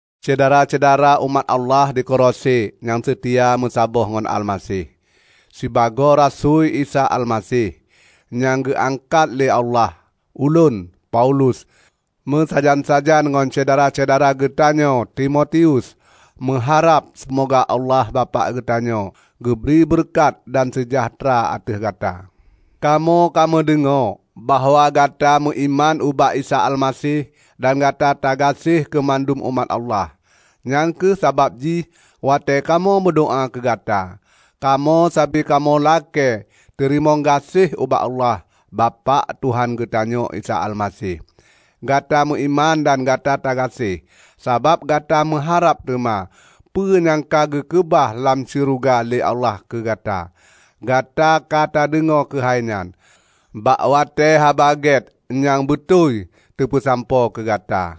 Syedara-syedara umat Allah di Kolose nyang seutia meusaboh ngon Almaseh! Sibagoe rasui Isa Almaseh, -- nyang geuangkat lé Allah -- ulôn, Paulus, meusajan-sajan ngon syedara-syedara geutanyoe Timotius, meuharab seumoga Allah Bapak geutanyoe geubri beureukat dan seujahteura ateueh gata. Kamoe ka meudeungoe bahwa gata meuiman ubak Isa Almaseh dan gata tagaséh keumandum umat Allah. Nyang kheueh sabab jih watée kamoe meudoá keugata, kamoe sabe kamoe lakée teurimong gaséh ubak Allah, Bapak Tuhan geutanyoe Isa Almaseh. Gata meuiman dan gata tagaséh, sabab gata meuharab teuma peue nyang ka geukeubah lam syeuruga lé Allah keugata. Gata katadeungoe keuhai nyan, bak watée Haba Gét nyang beutôi teupeusampoe keu gata.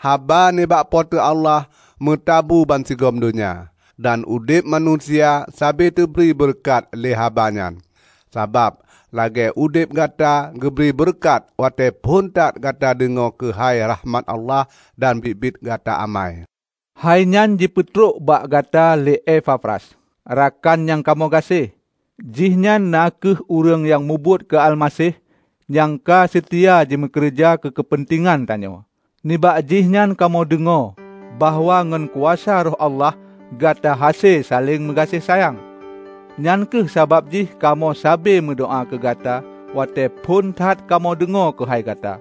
Haba nibak Po teu Allah meutabu bansigom donya, dan udeb manusia sabe teubri beureukat lé haba nyan, sabab lagée udeb gata geubri beureukat watée phon that gata deungoe keuhai rahmat Allah dan biet-biet gata amai. Hai nyan jipeutrok bak gata lé Epafras, rakan nyang kamoe gaséh. Jihnyan na kheueh ureuëng nyang mubuet keu Almaseh nyang ka seutia jimeukeureuja keu keupeuntengan tanyoe. Nibak jihnyan kamoe deungoe bahwa ngon kuasa Roh Allah gata hase saléng meugaséh sayang. Nyang kheueh sabab jih kamoe sabe meudoá keugata watée phon that kamoe deungoe keuhai gata.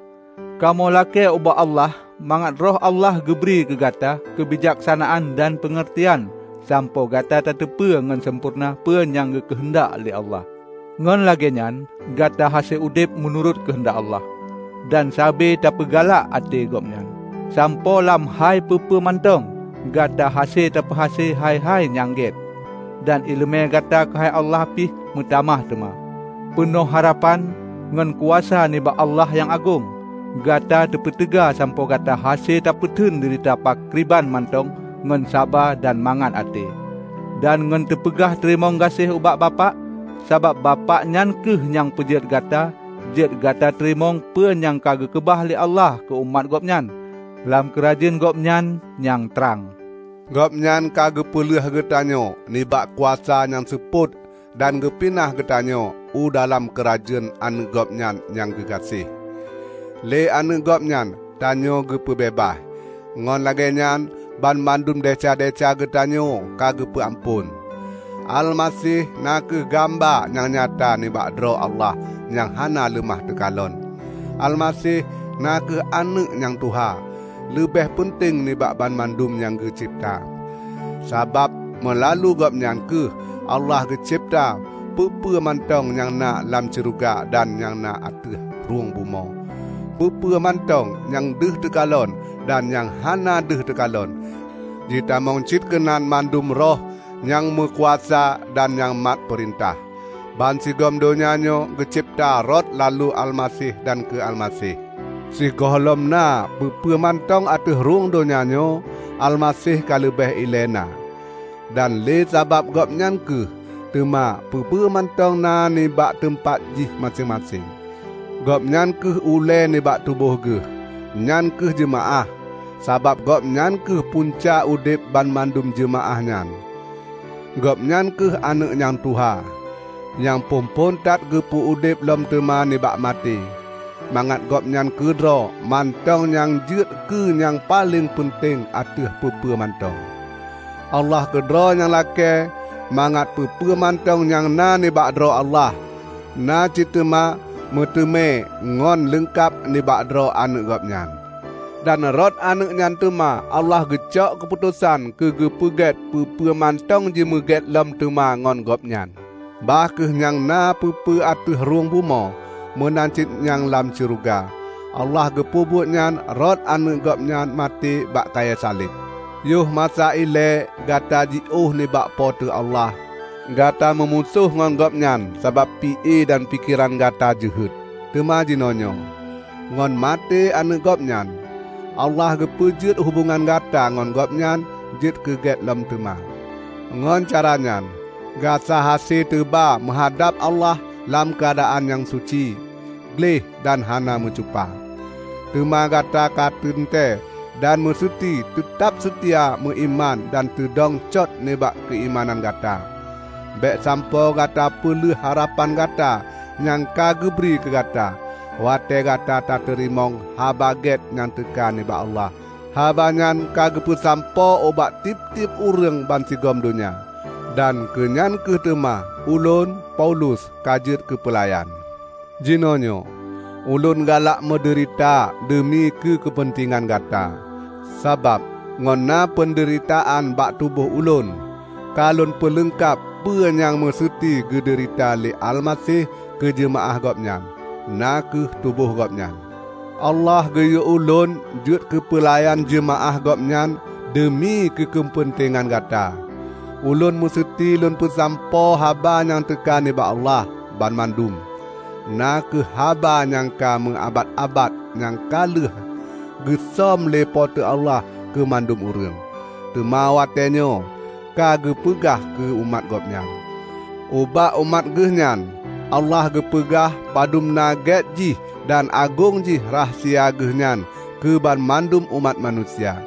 Kamoe lakée ubak Allah mangat Roh Allah geubri keugata keubijaksanaan dan peungeurtian sampoe gata tateupeue ngon sampoereuna peue nyang geukeuheundak lé Allah. Ngon lagée nyan gata hase udeb meunurot keuheundak Allah, dan sabe tapeugalak até Gobnyan, sampoe lam hai peue-peue mantong gata hase tapeuhase hai-hai nyang gét. Dan iéleumé gata keuhai Allah pih meutamah teuma. Peunoh harapan, ngon kuasa nibak Allah nyang agong, gata teupeuteuga sampoe gata hase tapeuteun deurita pakriban mantong ngon saba dan mangat até dan ngon teupeugah teurimong gaséh ubak Bapak. Sabab Bapak nyan kheueh nyang peujeuet gata jeuet gata teurimong peue nyang geukeubah lé Allah keu umat Gobnyan lam keurajeuen gobnyan nyang trang. Gobnyan ka geupeuleueh geutanyoe nibak kuasa nyang seupôt dan geupinah geutanyoe u dalam keurajeuen Aneuëk Gobnyan nyang geugaséh. Lé Aneuëk Gobnyan tanyoe geupeubeubaih; ngon lagée nyan banmandum desya-desya geutanyoe ka geupeu amphon. Almaseh na kheueh gamba nyang nyata nibak droe Allah nyang hana leumah teukalon; Almaseh na kheueh aneuëk nyang tuha, leubeh peunteng nibak banmandum nyang geucebta. Sabab meulalu Gobnyan kheueh Allah geucebta peue-peue mantong nyang na lam syeuruga dan nyang na ateueh rhung bumoe, peue-peue mantong nyang deuh teukalon dan nyang hana deuh teukalon, jitamong cit keunan mandum roh nyang meukuasa dan nyang mat peurintah. Bansigom donya nyoe geucebta rot lalu Almaseh dan keu Almaseh. Sigohlom na peue-peue mantong ateueh rhung donya nyoe, Almaseh ka leubeh ilée na. Dan lé sabab Gobnyan kheueh teuma peue-peue mantong na nibak teumpat jih maséng-maséng. Gobnyan kheueh ulée nibak tuboh geuh, nyan kheueh jeumaáh, sabab Gobnyan kheueh punca udeb banmandum jeumaáh nyan. Gobnyan kheueh aneuëk nyang tuha, nyang phon-phon that geupeu udeb lom teuma nibak maté, mangat Gobnyan keudroe mantong nyang jeuet keu nyang paleng peunteng ateueh peue-peue mantong. Allah keudroe nyang lakée mangat peue-peue mantong nyang na nibak droe Allah, na cit teuma meuteumé ngon leungkab nibak droe Aneuëk Gobnyan. Dan rot Aneuëk nyan teuma Allah geucok keuputosan keugeupeugét peue-peue mantong jimeugét lom teuma ngon Gobnyan -- bah kheueh nyang na peue-peue ateueh rhueng bumoe, meunan cit nyang lam syeuruga. Allah geupeubuet nyan rot Aneuëk Gobnyan maté bak kayée saleb. Yoh masa ilée gata jiôh nibak Po teu Allah. Gata meumusoh ngon Gobnyan sabab pi-e dan pikeran gata jeuhet. Teuma jinoenyoe, ngon maté Aneuëk Gobnyan, Allah geupeujeuet hubongan gata ngon Gobnyan jeuet keu gét lom teuma. Ngon cara nyan gata hase teuba meuhadab Allah lam keuadaan nyang suci, gleh dan hana meucupa. Teuma gata kateuntée dan meuseuti teutab seutia meuiman dan teudong cot nibak keuimanan gata. Bék sampoe gata peulheueh harapan gata nyang ka geubri keugata watée gata tateurimong Haba Gét nyang teuka nibak Allah. Haba nyan ka geupeusampoe ubak tieb-tieb ureuëng bansigom donya. Dan keunyan kheueh teuma ulôn, Paulus, ka jeuet keupeulayan. Jinoenyoe ulôn galak meudeurita deumi keu keupeuntengan gata. Sabab ngon na peundeuritaan bak tuboh ulôn, ka lôn peuleungkab peue nyang meuseuti geudeurita lé Almaseh keujeumaáh Gobnyan, na kheueh tuboh Gobnyan. Allah geuyue ulôn jeuet keupeulayan jeumaáh Gobnyan deumi keu keupeuntengan gata. Ulôn meuseuti lôn peusampoe haba nyang teuka nibak Allah, banmandum; na kheueh haba nyang ka meuabat-abat nyang ka lheueh geusöm lé Po teu Allah keumandum ureuëng, teuma watée nyoe ka geupeugah keu umat Gobnyan. Ubak umat Geuhnyan Allah geupeugah padun na gét jih dan agong jih rahsia Geuhnyan keu banmandum umat manusia.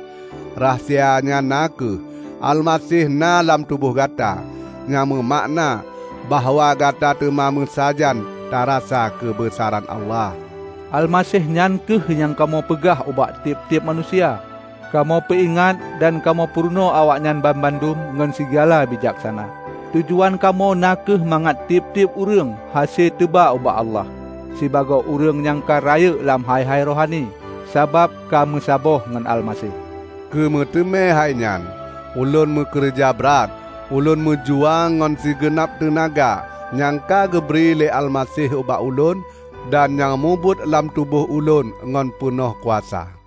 Rahasia nyan na kheueh: Almaseh na lam tuboh gata, nyang meumakna bahwa gata teuma meusajan tarasa keubeusaran Allah. Almaseh nyan kheueh nyang kamoe peugah ubak tieb-tieb manusia. Kamoe peuingat dan kamoe peurunoe awaknyan banmandum ngon sigala bijaksana. Tujuan kamoe na kheueh mangat tieb-tieb ureuëng hase teuba ubak Allah, sibagoe ureuëng nyang ka rayeuk lam hai-hai rohani, sabab ka meusaboh ngon Almaseh. Keumeuteumé hainyan ulôn meukeureuja brat. Ulôn meujuang ngon sigeunab teunaga nyang ka geubri lé Almaseh ubak ulôn dan nyang mubuet lam tuboh ulôn ngon peunoh kuasa.